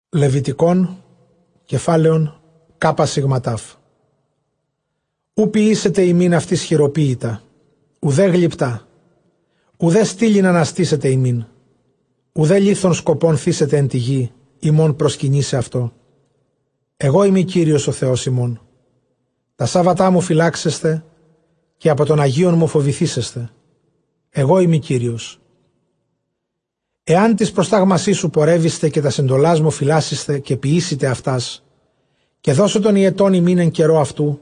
Ἐγὼ Κύριος ὁ Θεὸς ὑμῶν· οὐ ποιήσετε ὑμῖν αὐτοῖς χειροποίητα, οὐδὲ γλυπτὰ, οὐδὲ στήλην ἀναστήσετε ὑμῖν, οὐδὲ λίθον σκοπὸν θήσετε ἐν τῇ γῇ ὑμῶν προσκυνῆσαι αὐτῷ· ἐγώ εἰμι Κύριος ὁ Θεὸς ὑμῶν. Τὰ σάββατά μου φυλάξεσθε, καὶ ἀπὸ τῶν ἁγίων μου φοβηθήσεσθε· ἐγώ εἰμι Κύριος. Ἐὰν τοῖς προστάγμασί μου πορεύησθε, καὶ τὰς ἐντολάς μου φυλάσσησθε, καὶ ποιήσητε αὐτὰς, καὶ δώσω τὸν ὑετὸν ὑμῖν ἐν καιρῷ αὐτοῦ,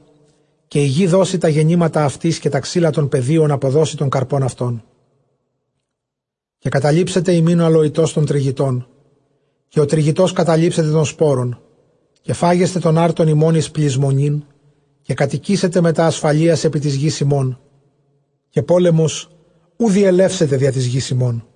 καὶ ἡ γῆ δώσει τὰ γεννήματα αὐτῆς, καὶ τὰ ξύλα τῶν πεδίων ἀποδώσει τὸν καρπὸν αὐτῶν· Καὶ καταλήψεται ὑμῖν ὁ ἁλοητὸς τὸν τρυγητὸν, καὶ ὁ τρυγητὸς καταλήψεται τὸν σπόρον· καὶ φάγεσθε τὸν ἄρτον ὑμῶν εἰς πλησμονήν· καὶ κατοικήσετε μετὰ ἀσφαλείας ἐπὶ τῆς γῆς ὑμῶν, καὶ πόλεμος οὐ διελεύσεται διὰ τῆς γῆς ὑμῶν·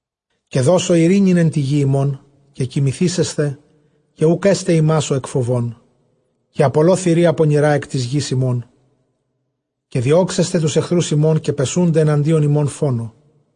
Καὶ δώσω εἰρήνην ἐν τῇ γῇ ὑμῶν· καὶ κοιμηθήσεσθε, καὶ οὐκ ἔσται ὑμᾶς ὁ ἐκφοβῶν· καὶ ἀπολῶ θηρία πονηρὰ ἐκ τῆς γῆς ὑμῶν. Καὶ διώξεσθε τοὺς ἐχθροὺς ὑμῶν, καὶ πεσοῦνται ἐναντίον ὑμῶν φόνῳ.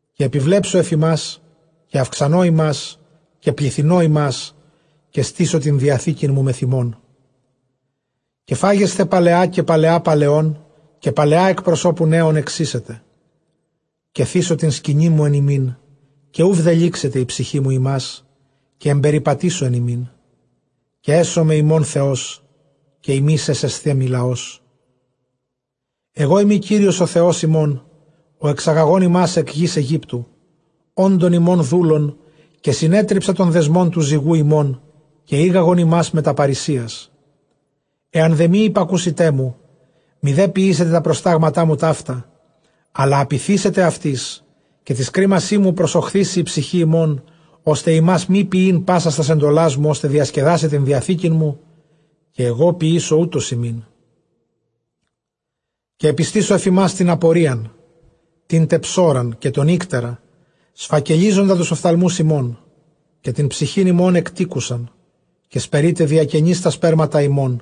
Καὶ ἐπιβλέψω ἐφʼ ὑμᾶς, καὶ αὐξανῶ ὑμᾶς, καὶ πληθυνῶ ὑμᾶς, καὶ στήσω τὴν διαθήκην μου μεθʼ ὑμῶν· Καὶ φάγεσθε παλαιὰ καὶ παλαιὰ παλαιῶν, καὶ παλαιὰ ἐκ προσώπου νέων ἐξοίσετε. Καὶ θήσω τὴν σκηνήν μου ἐν ὑμῖν, καὶ οὐ βδελύξεται ἡ ψυχή μου ὑμᾶς, καὶ ἐμπεριπατήσω ἐν ὑμῖν· καὶ ἔσομαι ὑμῶν Θεὸς, καὶ ὑμεῖς ἔσεσθέ μοι λαός. Ἐγώ εἰμι Κύριος ὁ Θεὸς ὑμῶν, ὁ ἐξαγαγὼν ὑμᾶς ἐκ γῆς Αἰγύπτου, ὄντων ὑμῶν δούλων· καὶ συνέτριψα τὸν δεσμὸν τοῦ ζυγοῦ ὑμῶν, καὶ ἤγαγον ὑμᾶς μετὰ παῤῥησίας. Ἐὰν δὲ μὴ ὑπακούσητέ μου, μηδὲ ποιήσητε τὰ προστάγματά μου ταῦτα, ἀλλὰ ἀπειθήσητε αὐτοῖς, καὶ τοῖς κρίμασί μου προσοχθίσῃ ἡ ψυχὴ ὑμῶν, ὥστε ὑμᾶς μὴ ποιεῖν πάσας τὰς ἐντολάς μου, ὥστε διασκεδάσαι τὴν διαθήκην μου, καὶ ἐγὼ ποιήσω οὕτως ὑμῖν· καὶ ἐπιστήσω ἐφʼ ὑμᾶς τὴν ἀπορίαν, τήν τε ψώραν, καὶ τὸν ἴκτερα σφακελίζοντα τοὺς ὀφθαλμοὺς ὑμῶν, καὶ τὴν ψυχὴν ὑμῶν ἐκτήκουσαν· καὶ σπερεῖτε διακενῆς τὰ σπέρματα ὑμῶν,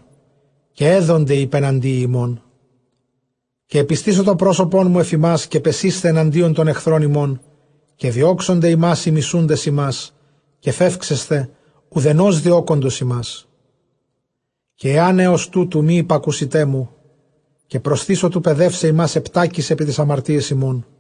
καὶ ἔδονται οἱ ὑπεναντίοι ὑμῶν. Καὶ ἐπιστήσω τὸ πρόσωπόν μου ἐφʼ ὑμᾶς, καὶ πεσεῖσθε ἐναντίον τῶν ἐχθρῶν ὑμῶν, καὶ διώξονται ὑμᾶς οἱ μισοῦντες ὑμᾶς, καὶ φεύξεσθε οὐδενὸς διώκοντος ὑμᾶς. Καὶ ἐὰν ἕως τούτου μὴ ὑπακούσητέ μου, καὶ προσθήσω τοῦ παιδεῦσαι ὑμᾶς ἑπτάκις ἐπὶ ταῖς ἁμαρτίαις ὑμῶν.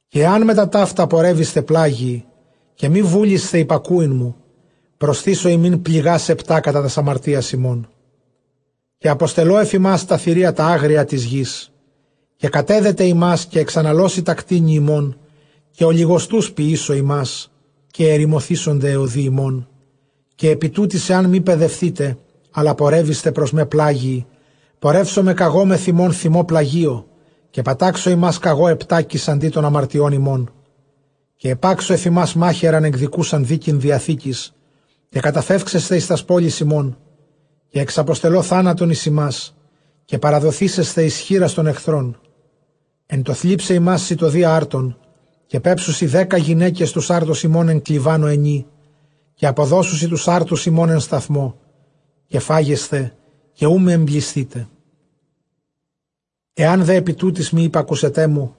Καὶ ἐὰν μετὰ ταῦτα πορεύησθε πλάγιοι, καὶ μὴ βούλησθε ὑπακούειν μου, προσθήσω ὑμῖν πληγὰς ἑπτὰ κατὰ τὰς ἁμαρτίας ὑμῶν. Καὶ ἀποστέλλω ἐφʼ ὑμᾶς τὰ θηρία τὰ ἄγρια τῆς γῆς, καὶ κατέδεται ὑμᾶς, καὶ ἐξαναλώσει τὰ κτήνη ὑμῶν, καὶ ὀλιγοστοὺς ποιήσω ὑμᾶς, καὶ ἐρημωθήσονται αἱ ὁδοὶ ὑμῶν. Καὶ ἐπὶ τούτοις ἐὰν μὴ παιδευθῆτε, ἀλλὰ πορεύησθε πρός με πλάγιοι, πορεύσομαι κᾀγὼ μεθʼ ὑμῶν θυμῷ πλαγίῳ, καὶ πατάξω ὑμᾶς κᾀγὼ ἑπτάκις ἀντὶ τῶν ἁμαρτιῶν ὑμῶν. Καὶ ἐπάξω ἐφʼ ὑμᾶς μάχαιραν ἐκδικοῦσαν δίκην διαθήκης, καὶ καταφεύξεσθε εἰς τὰς πόλεις ὑμῶν· καὶ ἐξαποστελῶ θάνατον εἰς ὑμᾶς, καὶ παραδοθήσεσθε εἰς χεῖρας τῶν ἐχθρῶν. Ἐν τῷ θλίψαι ὑμᾶς σιτοδείᾳ ἄρτων, καὶ πέψουσι δέκα γυναῖκες τοὺς ἄρτους ὑμῶν ἐν κλιβάνῳ ἑνὶ, καὶ ἀποδώσουσι τοὺς ἄρτους ὑμῶν ἐν σταθμῷ, καὶ φάγεσθε, καὶ οὐ μὴ ἐμπλησθῆτε. Ἐὰν δὲ ἐπὶ τούτοις μὴ ὑπακούσητέ μου,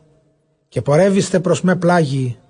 καὶ πορεύησθε πρός με πλάγιοι,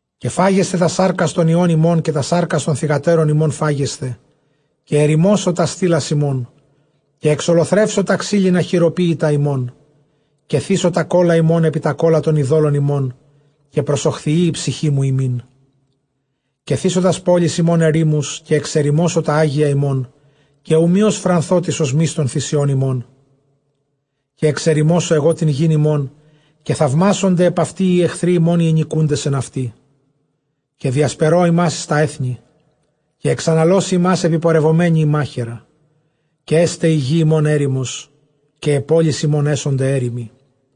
Καὶ φάγεσθε τὰς σάρκας τῶν υἱῶν ὑμῶν, καὶ τὰς σάρκας τῶν θυγατέρων ὑμῶν φάγεσθε. Καὶ ἐρημώσω τὰς στήλας ὑμῶν, καὶ ἐξολοθρεύσω τὰ ξύλινα χειροποίητα ὑμῶν, καὶ θήσω τὰ κῶλα ὑμῶν ἐπὶ τὰ κῶλα τῶν εἰδώλων ὑμῶν, καὶ προσοχθιεῖ ἡ ψυχή μου ὑμῖν. Καὶ θήσω τὰς πόλεις ὑμῶν ἐρήμους, καὶ ἐξερημώσω τὰ ἅγια ὑμῶν, καὶ οὐ μὴ ὀσφρανθῶ τῆς ὀσμῆς τῶν θυσιῶν ὑμῶν. Καὶ ἐξερημώσω ἐγὼ τὴν γῆν ὑμῶν, καὶ θαυμάσονται ἐπʼ αὐτῇ οἱ ἐχθροὶ ὑμῶν, οἱ ἐνοικοῦντες ἐν αὐτῇ. Καὶ διασπερῶ ὑμᾶς εἰς τὰ ἔθνη, καὶ ἐξαναλώσει ὑμᾶς ἐπιπορευομένη ἡ μάχαιρα, καὶ ἔσται ἡ γῆ ὑμῶν ἔρημος, καὶ αἱ πόλεις ὑμῶν ἔσονται ἔρημοι.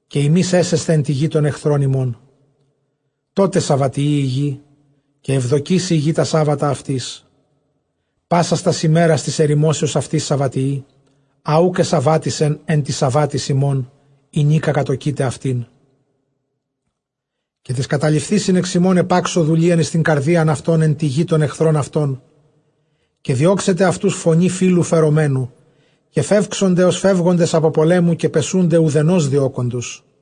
καὶ ὑμεῖς ἔσεσθε ἐν τῇ γῇ τῶν ἐχθρῶν ὑμῶν· τότε σαββατιεῖ ἡ γη, καὶ εὐδοκήσει ἡ γῆ τὰ σάββατα αὐτῆς πάσας τὰς ἡμέρας τῆς ἐρημώσεως αὐτῆς· σαββατιεῖ ἃ οὐκ ἐσαββάτισεν ἐν τοῖς σαββάτοις ὑμῶν, ἡνίκα κατῳκεῖτε αὐτήν. Καὶ τοῖς καταλειφθεῖσιν ἐξ ὑμῶν ἐπάξω δουλείαν εἰς τὴν καρδίαν αὐτῶν ἐν τῇ γῇ τῶν ἐχθρῶν αὐτῶν· καὶ διώξεται αὐτοὺς φωνὴ φύλλου φερομένου, καὶ φεύξονται ὡς φεύγοντες ἀπὸ πολέμου, καὶ πεσοῦνται οὐθενὸς διώκοντος.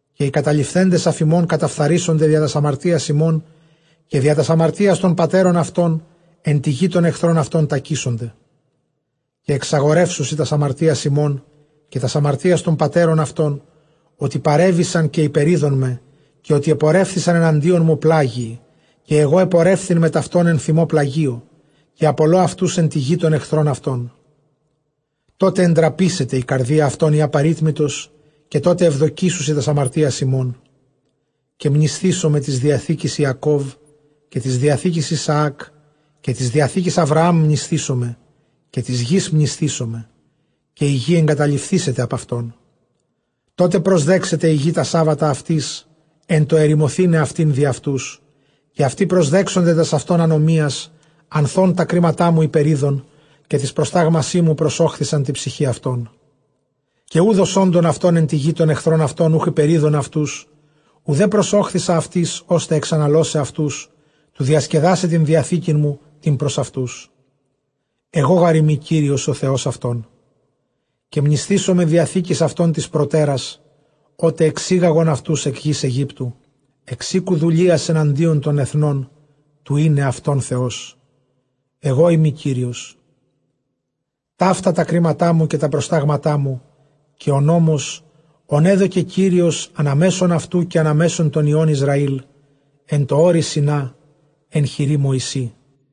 Καὶ οἱ καταλειφθέντες ἀφʼ ὑμῶν, καταφθαρήσονται διὰ τὰς ἁμαρτίας αὐτῶν, καὶ διὰ τὰς ἁμαρτίας τῶν πατέρων αὐτῶν· ἐν τῇ γῇ τῶν ἐχθρῶν αὐτῶν τακήσονται. Καὶ ἐξαγορεύσουσι τὰς ἁμαρτίας αὐτῶν, καὶ τὰς ἁμαρτίας τῶν πατέρων αὐτῶν, ὅτι παρέβησαν καὶ ὑπερεῖδόν με, καὶ ὅτι ἐπορεύθησαν ἐναντίον μου πλάγιοι, καὶ ἐγὼ ἐπορεύθην μετʼ αὐτῶν ἐν θυμῷ πλαγίῳ· καὶ ἀπολῶ αὐτοὺς ἐν τῇ γῇ τῶν ἐχθρῶν αὐτῶν· τότε ἐντραπήσεται ἡ καρδία αὐτῶν ἡ ἀπερίτμητος, καὶ τότε εὐδοκήσουσι τὰς ἁμαρτίας αὐτῶν. Καὶ μνησθήσομαι τῆς διαθήκης Ἰακὼβ, καὶ τῆς διαθήκης Ἰσαὰκ, καὶ τῆς διαθήκης Ἁβραὰμ μνησθήσομαι. Καὶ τῆς γῆς μνησθήσομαι, καὶ ἡ γῆ ἐγκαταλειφθήσεται ἀπʼ αὐτῶν· τότε προσδέξεται ἡ γῆ τὰ σάββατα αὐτῆς, ἐν τῷ ἐρημωθῆναι αὐτὴν διʼ αὐτούς· καὶ αὐτοὶ προσδέξονται τὰς αὐτῶν ἀνομίας, ἀνθʼ ὧν τὰ κρίματά μου ὑπερεῖδον, καὶ τοῖς προστάγμασί μου προσώχθισαν τῇ ψυχῇ αὐτῶν. Καὶ οὐδʼ ὡς ὄντων αὐτῶν ἐν τῇ γῇ τῶν ἐχθρῶν αὐτῶν, οὐχ ὑπερεῖδον αὐτούς, οὐδὲ προσώχθισα αὐτοῖς ὥστε ἐξαναλῶσαι αὐτούς τοῦ διασκεδάσαι τὴν διαθήκην μου τὴν πρὸς αὐτούς· ἐγὼ γάρ εἰμι Κύριος ὁ Θεὸς αὐτῶν. Καὶ μνησθήσομαι διαθήκης αὐτῶν τῆς προτέρας, ὅτε ἐξήγαγον αὐτοὺς ἐκ γῆς Αἰγύπτου, ἐξ οἴκου δουλείας ἔναντι τῶν ἐθνῶν, τοῦ εἶναι αὐτῶν Θεός· ἐγώ εἰμι Κύριος. Ταῦτα τὰ κρίματά μου, καὶ τὰ προστάγματά μου, καὶ ὁ νόμος ὃν ἔδωκε Κύριος ἀναμέσον αὐτοῦ καὶ ἀναμέσον τῶν υἱῶν Ἰσραὴλ, ἐν τῷ ὄρει Σινᾷ ἐν χειρὶ Μωυσῆ.